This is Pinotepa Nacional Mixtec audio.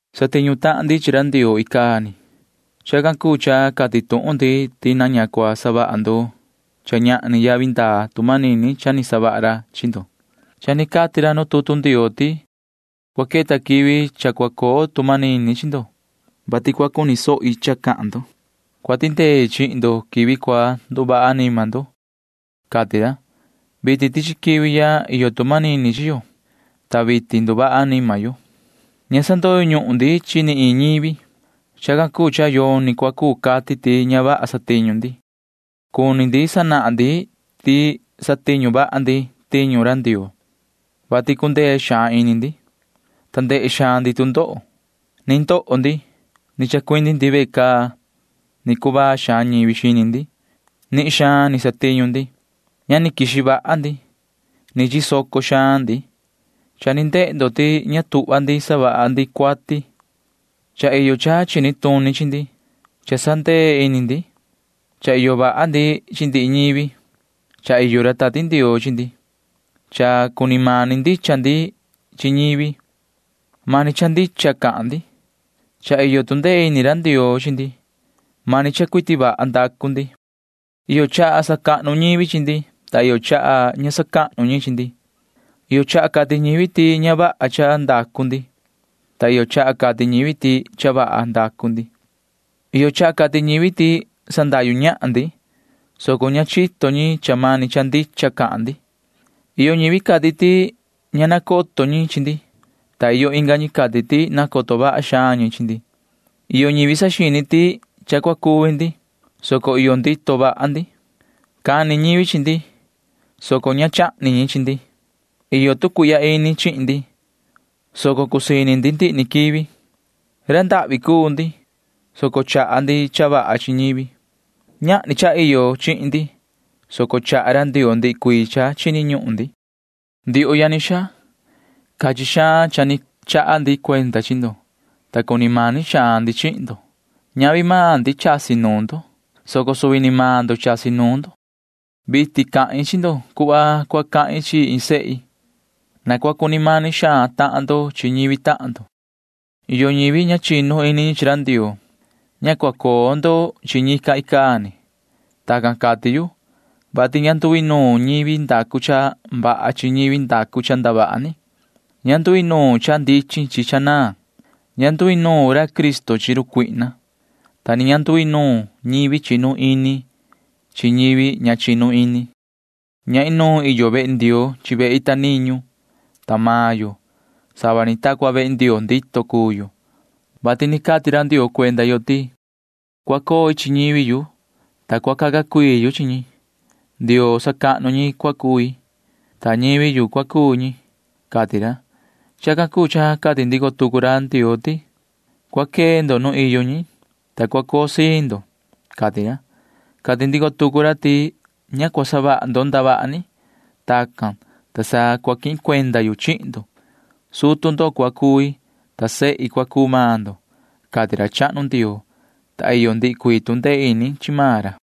Satiñu tahan ndi chi ra Ndioo icaa ni. Chacan cuu cha cati tuhun ndi ti na ña cua savaha ndo cha ñahni yavi ndaa tu manini cha ni savaha ra chi ndo. Cha ni cati ra nu tutu Ndioo ti: Cua queta quivi cha cua coo tu manini chi ndo, vati cua cuni sohi cha cahan ndo. Cua tindei chihin ndo quivi cua nduvaha anima ndo, cati ra. Vitin tichi quivi ya iyo tu manini chi yo, ta vitin nduvaha anima yo. Ña sandoyo ñuhun ndi chi ni iin ñivi. Chacan cuu cha yoni cua cuu cati ti ña vaha satiñu ndi. Cuni ndi sanahan ndi ti satiñu vaha ndi tiñu ra Ndioo, vati cundee xaan ini ndi, ta ndehe xaan ndi tu ndoho. Ni ndoho ndi. Ni chacuindi ndi ve caa. Ni cuvaa xaan ñivi xini ndi. Nihin xaan ni satiñu ndi. Ña ni quixi vaha ndi. Ni chisoco xaan ndi. Cha ni ndehe ndo ti ña tuhva ndi savaha ndi cuati. Cha iyo cha chini tuni chi ndi. Cha sandee ini ndi. Cha iyo vaha ndi chi ndihi ñivi. Cha iyo ra Tati Ndioo chi ndi. Cha cuni mani ndicha ndi chi ñivi. Mani cha ndicha cahan ndi. Cha iyo tu ndee ini ra Ndioo chi ndi. Mani cha cuiti vaha ndacu ndi. Iyo chaha sacahnu ñivi chi ndi, ta iyo chaha ña sacahnu ñi chi ndi. Iyo chaha cati ñivi ti ña vaha cha ndacu ndi, ta iyo chaha cati ñivi ti cha vaha ndacu ndi. Iyo chaha cati ñivi ti sandahyu ñahan ndi, soco ña chito ñi cha mani cha ndicha cahan ndi. Iyo ñivi cati ti ña nacoto ñi chi ndi, ta iyo inga ñi cati ti nacoto vaha xaan ñi chi ndi. Iyo ñivi saxini ti cha cua cuvi ndi, soco iyo ndito vaha ndi. Cani ñivi chi ndi, soco ña ni chahni ñi chi ndi. Iyo tu cuihya ini chihin ndi, soco cusii ini ndi ndihi ni quivi. Ra ndahvi cuu ndi, soco chaha ndi cha vaha chi ñivi. Ñahni cha iyo chihin ndi, soco chaha ra Ndioo ndihi cuii cha chini ñuhun ndi. Ndioho yani xaa, cachin xaan cha ni chaha ndi cuenda chi ndo, ta cuni mani xaan ndi chihin ndo. Ñavi maan ndi chasi nuun ndo, soco suvi ni maan ndo chasi nuun ndo. Vitin cahin chi ndo cuhva cua cahin chi iin sehi. Na cua cuni mani xaan tahan ndo chi ñivi tahan ndo. Iyo ñivi ña chinu ini chi ra Ndioo. Ña cua coo ndo chi ñi icaa ni. Tacan cati yu, vati ña nduinuun ñivi ndacu cha vaha chi ñivi ndacu cha ndavaha ni. Ña nduinuun cha ndichin chi cha naan. Ña nduinuun ra Cristo chi run Satanaa, ta ni ña nduinuun ñivi chinu ini chi ñivi ña chinu ini. Ña inuun iyo vehe Ndioo chi vehe ita niñu. Ta maan yo―sava ni ta cua vehe Ndioo ndito cuu yo, vati ni cati ra Ndioo cuenda yo ti: Cua coi chi ñivi yu, ta cua caca cui chi ñi. Ndioo sacahnu ñi cua cui, ta ñivi yu cua cuu ñi, cati ra. Chacan cuu cha cati ndico tucu ra Ndioo ti: Cua quee ndo nu iyo ñi, ta cua coo siin ndo, cati ra. Cati ndico tucu ra ti: Ña cua savaha ndo ndavaha ni. Tacan, ta sa cua quihin cuenda yu chihin ndo. Sutu ndo cua cui, ta sehi cua cuu maan ndo, cati ra chahnu Ndioo, ta iyo ndihi cuii tu ndee ini chi maan ra.